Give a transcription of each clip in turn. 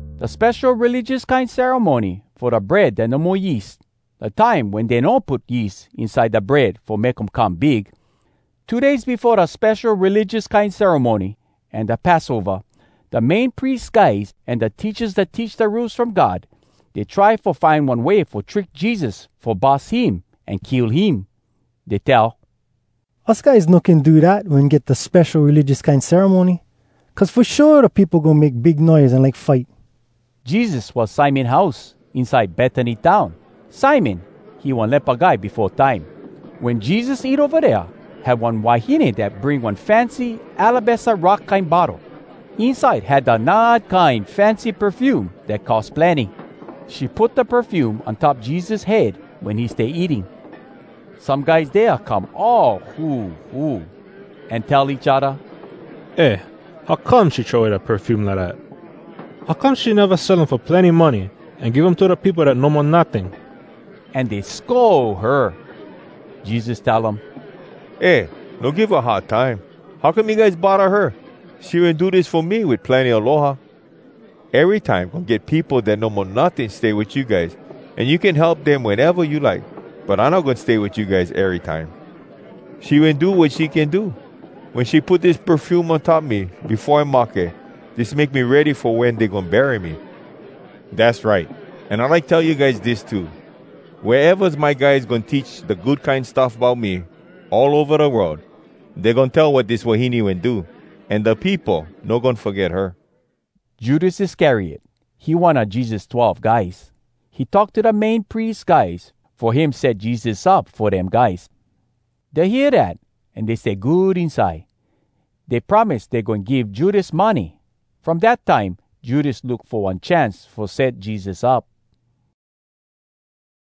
Da spesho religious kine ceremony fo da Bread Dat No Mo Yeast, da time wen dey no put yeast inside da bread fo make um come big. Two days befo da spesho religious kine ceremony an da Passova, da Main Pries guys an da teachas dat teach da Rules From God, dey try fo find one way fo trick Jesus fo bus him an kill him. Dey tell, “Us guys no can do dat wen get da spesho religious kine ceremony, cuz fo shua da peopo goin make big noise an like fight.” Jesus was Simon house, inside Betany town. Simon, he one lepa guy befo time. Wen Jesus eat ova dea, had one wahine dat bring one fancy alabaster rock kine bottle. Inside had da nard kine fancy perfume dat cost plenny. She put da perfume on top Jesus head wen he stay eating. Some guys dea come all huhu, an tell each odda, “Eh, how come she throw way da perfume lidat? How come she neva sell um fo plenny money, an give um to da peopo dat no mo notting?” An dey scold her. Jesus tell um, “Eh, no give her hard time! How come you guys bodda her? She wen do dis fo me wit plenny aloha. Erytime goin get peopo dat no mo notting stay wit you guys, an you can help dem weneva you like. But I no goin stay wit you guys erytime. She wen do wat she can do. Wen she put dis perfume on top me befo I mahke, dis make me ready fo wen dey goin bury me. Dass right! An I like tell you guys dis too: Wea evas my guys goin teach da Good Kine Stuff Bout Me all ova da world, dey goin tell wat dis wahine wen do, an da peopo no goin foget her.” Judas Iscariot, he one a Jesus twelve guys. He talk to da Main Pries guys, fo him set Jesus up fo dem guys. Dey hear dat, an dey stay good inside. Dey promise dey goin give Judas money. From dat time, Judas look fo one chance fo set Jesus up.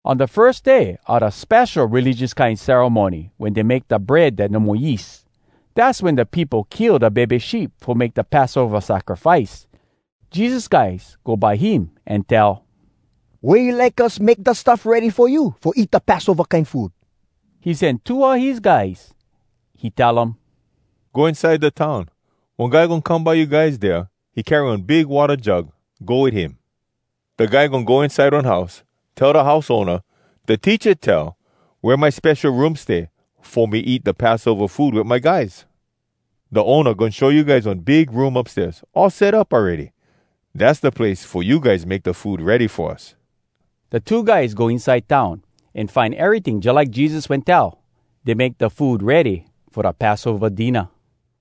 On da firs day a da spesho religious kine ceremony wen dey make da Bread Dat No Mo Yeast, dass wen da peopo kill da bebe sheep fo make da Passova sacrifice, Jesus guys go by him an tell, “Wea you like us make da stuff ready fo you fo eat da Passova kine food?” He sen two a his guys. He tell um, “Go inside da town. One guy goin come by you guys dea. He carry one big watta jug. Go wit him. Da guy goin go inside one house. Tell da house owna, ‘Da Teacha tell, “Wea my spesho room stay, fo me eat da Passova food wit my guys?” ’ Da owna goin show you guys one big room upstairs, all set up awready. Dass da place fo you guys make da food ready fo us.” Da two guys go inside town, an find eryting jalike Jesus wen tell. Dey make da food ready fo da Passova dinna.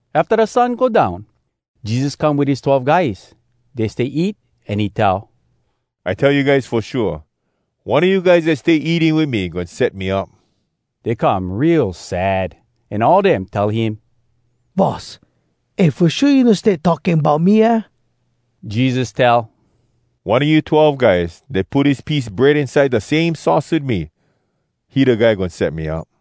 Afta da sun go down, Jesus come wit his twelve guys. Dey stay eat, an he tell, “I tell you guys fo shua: one a you guys dat stay eating wit me goin set me up!” Dey come real sad, an all dem tell him, “Boss, eh, fo shua you no stay talking bout me, aah?” Jesus tell, “One a you twelve guys dat put his piece bread inside da same sauce wit me, he da guy goin set me up.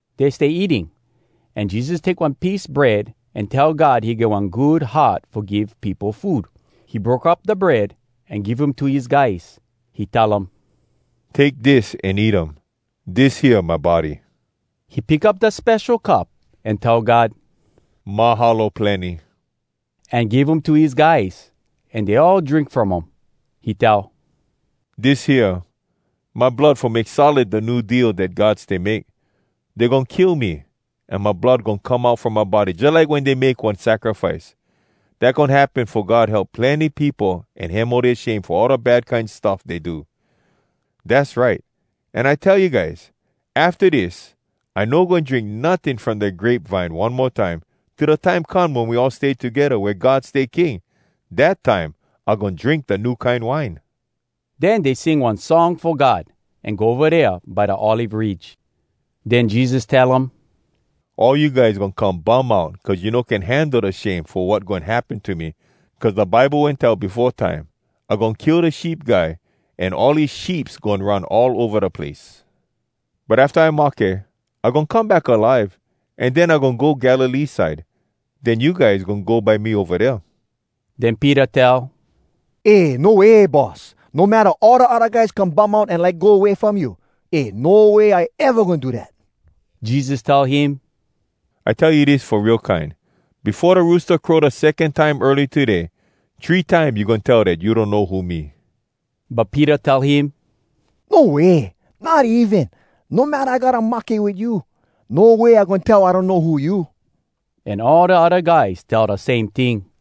Dey stay eating, an Jesus take one piece bread an tell God he get one good heart fo give peopo food. He broke up da bread, an give um to his guys. He tell um, “Take dis an eat um. Dis hea, my body.” He pick up da spesho cup an tell God, “Mahalo plenny!” an give um to his guys, an dey all drink from um. He tell, “Dis hea, my blood fo make solid da New Deal dat God stay make. Dey goin kill me, an my blood goin come out from my body jalike wen dey make one sacrifice. Dat goin happen fo God help plenny peopo an hemo dea shame fo all da bad kine stuff dey do. Dass right! An I tell you guys, afta dis I no goin drink notting from da grape vine one mo time till da time come wen we all stay togedda wea God stay king. Dat time, I goin drink da new kine wine.” Den dey sing one Song Fo God an go ova dea by da Olive Ridge. Den Jesus tell um, “All you guys goin come bum out cuz you no can handle da shame fo wat goin happen to me. Cuz da Bible wen tell befo time, ‘I goin kill da sheep guy, an all his sheeps goin run all ova da place.’ But afta I mahke, I goin come back alive, an den, I goin go Galilee side. Den you guys goin go by me ova dea.” Den Peter tell, “Eh, no way, Boss! No matta all da odda guys come bum out an like go way from you, eh, no way I eva goin do dat!” Jesus tell him, “I tell you dis fo real kine: Befo da roosta crow da secon time early today, three time you goin tell dat you donno who me.” But Peter tell him, “No way! Not even! No matta I gotta mahke wit you, no way I goin tell I donno who you!” An all da odda guys tell da same ting.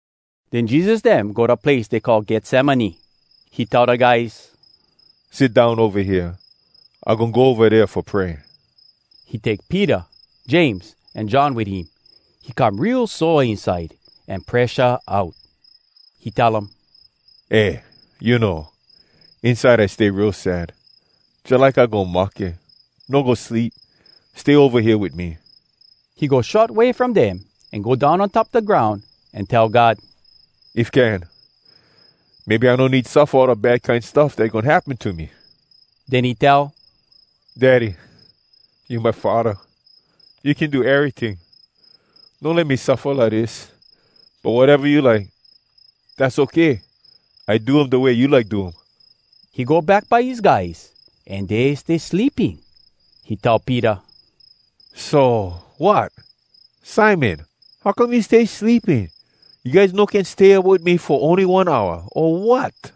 Den Jesus dem go da place dey call Getsemane. He tell da guys, “Sit down ova hea. I goin go ova dea fo pray.” He take Peter, James, an John wit him. He come real sore inside an presha out. He tell um, “Eh, you know, inside I stay real sad, jalike I goin mahke. No go sleep—stay ova hea wit me.” He go short way from dem, an go down on top da groun an tell God, “If can, maybe I no need suffa all da bad kine stuff dat goin happen to me!” Den he tell, “Daddy, you my Faddah. You can do eryting. No let me suffa lidis. But wateva you like, dass okay. I do um da way you like do um.” He go back by his guys, an dey stay sleeping. He tell Peter, “So, wat? Simon, how come you stay sleeping? You guys no can stay up wit me fo ony one hour, o wat?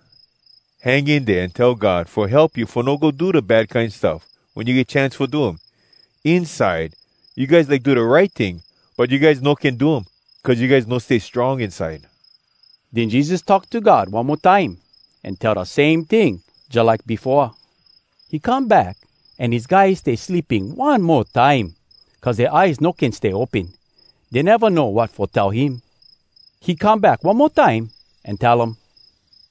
Hang in dea an tell God fo help you fo no go do bad kine stuff wen you get chance fo do um. Inside, you guys like do da right ting, but you guys no can do um, cuz you guys no stay strong inside.” Den Jesus talk to God one mo time, an tell da same ting jalike befoa. He come back, an his guys stay sleeping one mo time, cuz dea eyes no can stay open. Dey neva know wat fo tell him. He come back one mo time, an tell um,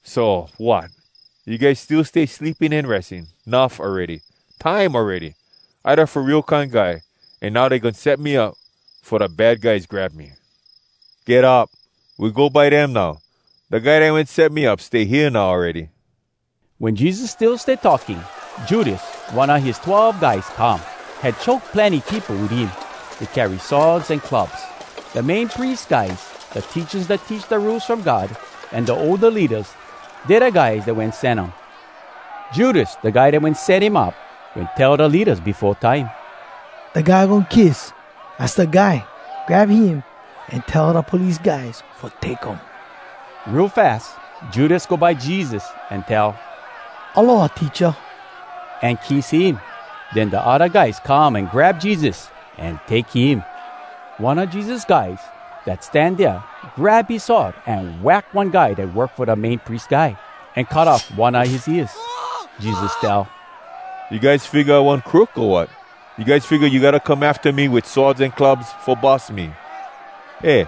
“So, wat? You guys still stay sleeping an ressing?! Nuff awready. Time awready! I da Fo Real Kine Guy, an now dey goin set me up fo da bad guys grab me. Get up! We go by dem now. Da guy dat wen set me up stay hea now awready.” Wen Jesus still stay talking, Judas, one a his twelve guys, come. Had choke plenny peopo wit him. Dey carry swords an clubs. Da Main Pries guys, da teachas dat teach da Rules From God, an da older leadas, dey da guys dat wen sen um. Judas, da guy dat wen set him up, wen tell da leadas befo time, “Da guy I goin kiss, az da guy. Grab him an tell da police guys fo take um!” Real fas, Judas go by Jesus an tell, “Aloha, Teacha!” an kiss him. Den da odda guys come an grab Jesus an take him. One a Jesus guys dat stan dea grab his sword an wack one guy dat work fo da Main Pries Guy, an cut off one a his ears. Jesus tell, “You guys figga I one crook, o wat? You guys figga you gotta come afta me wit swords an clubs fo bus me? Eh,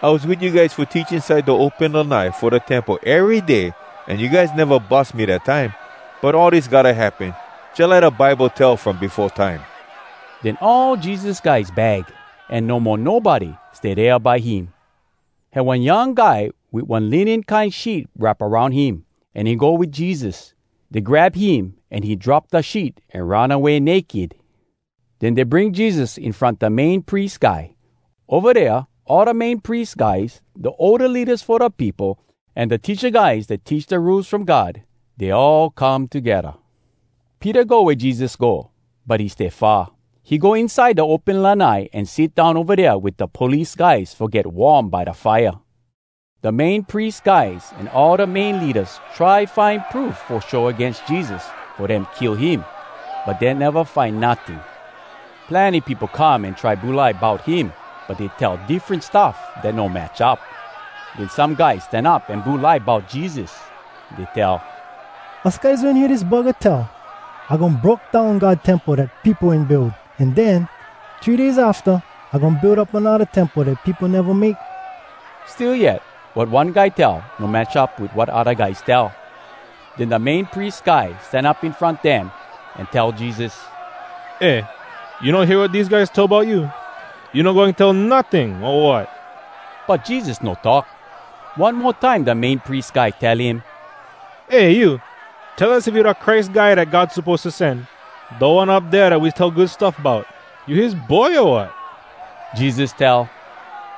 I was wit you guys fo teach inside da open lanai fo da Temple ery day, an you guys neva bus me dat time. But all dis gotta happen, jalike da Bible tell from befo time.” Den all Jesus guys bag, an no mo nobody stay dea by him. Had one young guy wit one linen kine sheet wrap aroun him, an he go wit Jesus. Dey grab him, an he drop da sheet an run away naked. Den dey bring Jesus in front da Main Pries Guy. Ova dea all da Main Pries guys, da older leadas fo da peopo, an da teacha guys dat teach da Rules From God, dey all come togedda. Peter go wea Jesus go, but he stay far. He go inside da open lanai an sit down ova dea wit da police guys fo get warm by da fire. Da Main Pries guys an all da main leadas try find proof fo show agains Jesus fo dem kill him, but dey neva find notting. Plenny peopo come an try bulai bout him, but dey tell diffren stuff dat no match up. Den some guys stan up an bulai bout Jesus. Dey tell, “Us guys wen hear dis buggah tell, ‘I goin broke down God Temple dat peopo wen build, an den, three days afta, I goin build up anodda temple, dat peopo neva make.’” Still yet, wat one guy tell no match up wit wat odda guys tell. Den da Main Pries Guy stan up in front dem, an tell Jesus, “Eh, you no hear wat dese guys tell bout you? You no goin tell notting, o wat?” But Jesus no talk. One mo time da Main Pries Guy tell him, “Eh you! Tell us if you da Christ Guy dat God suppose to sen. Da One Up Dea Dat We Tell Good Stuff Bout, you his Boy, o wat?” Jesus tell,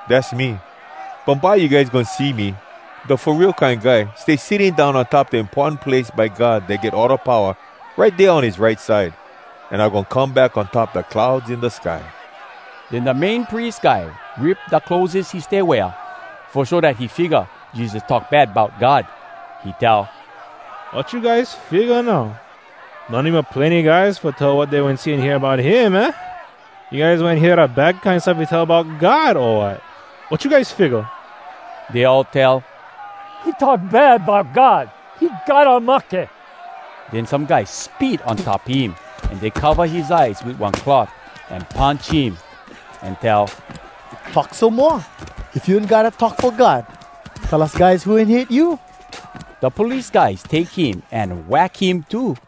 “Dass me. Bumbye you guys goin see me, da Fo Real Kine Guy, stay sitting down on top da importan place by God dat get all da powa, right dea on his right side. An I goin come back on top da clouds in da sky.” Den da Main Pries Guy rip da clotheses he stay wear, fo show dat he figga Jesus talk bad bout God. He tell, “Wat you guys figga now? No need mo plenny guys fo tell wat dey wen see an hear bout him, aah? You guys wen hear da bad kine stuff he tell bout God, o wat?! Wat you guys figga?” Dey all tell, “He talk bad bout God! He gotta mahke!” Den some guys spit on top him, an dey cova his eyes wit one cloth, an punch him, an tell, “Talk some moa! If you one guy dat talk fo God, tell us guys who wen hit you!” Da police guys take him an wack him too.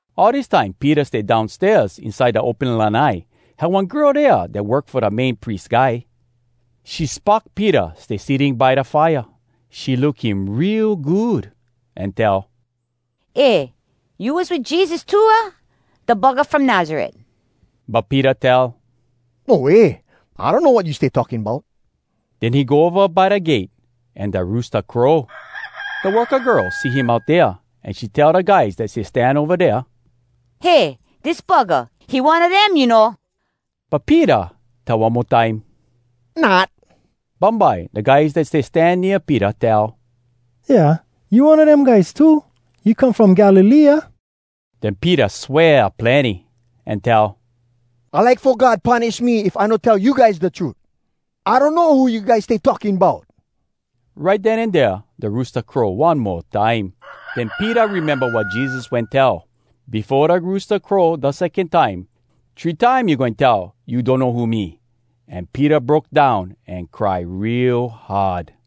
All dis time Peter stay downstairs inside da open lanai. Had one girl dea dat work fo da Main Pries Guy. She spock Peter stay sitting by da fire. She look him real good, an tell, “Eh, you was wit Jesus too, aah? da buggah from Nazaret.” But Peter tell, “No way! I donno wat you stay talking bout!” Den he go ova by da gate. An da roosta crow. Da worka girl see him out dea, an she tell da guys dat stay stan ova dea, “Hey! Dis buggah, he one a dem, you know!” But Peter tell one mo time, “Not!” Bumbye, da guys dat stay stan nea Peter tell, “Yeah! You one a dem guys too! You come from Galilee, aah?” Den Peter swear plenny, an tell, “I like fo God punish me if I no tell you guys da trut! I donno who you guys stay talking bout!” Right den an dea da roosta crow one mo time. Den Peter rememba wat Jesus wen tell, “Befo da roosta crow da secon time, three time you goin tell you donno who me.” An Peter broke down an cry real hard.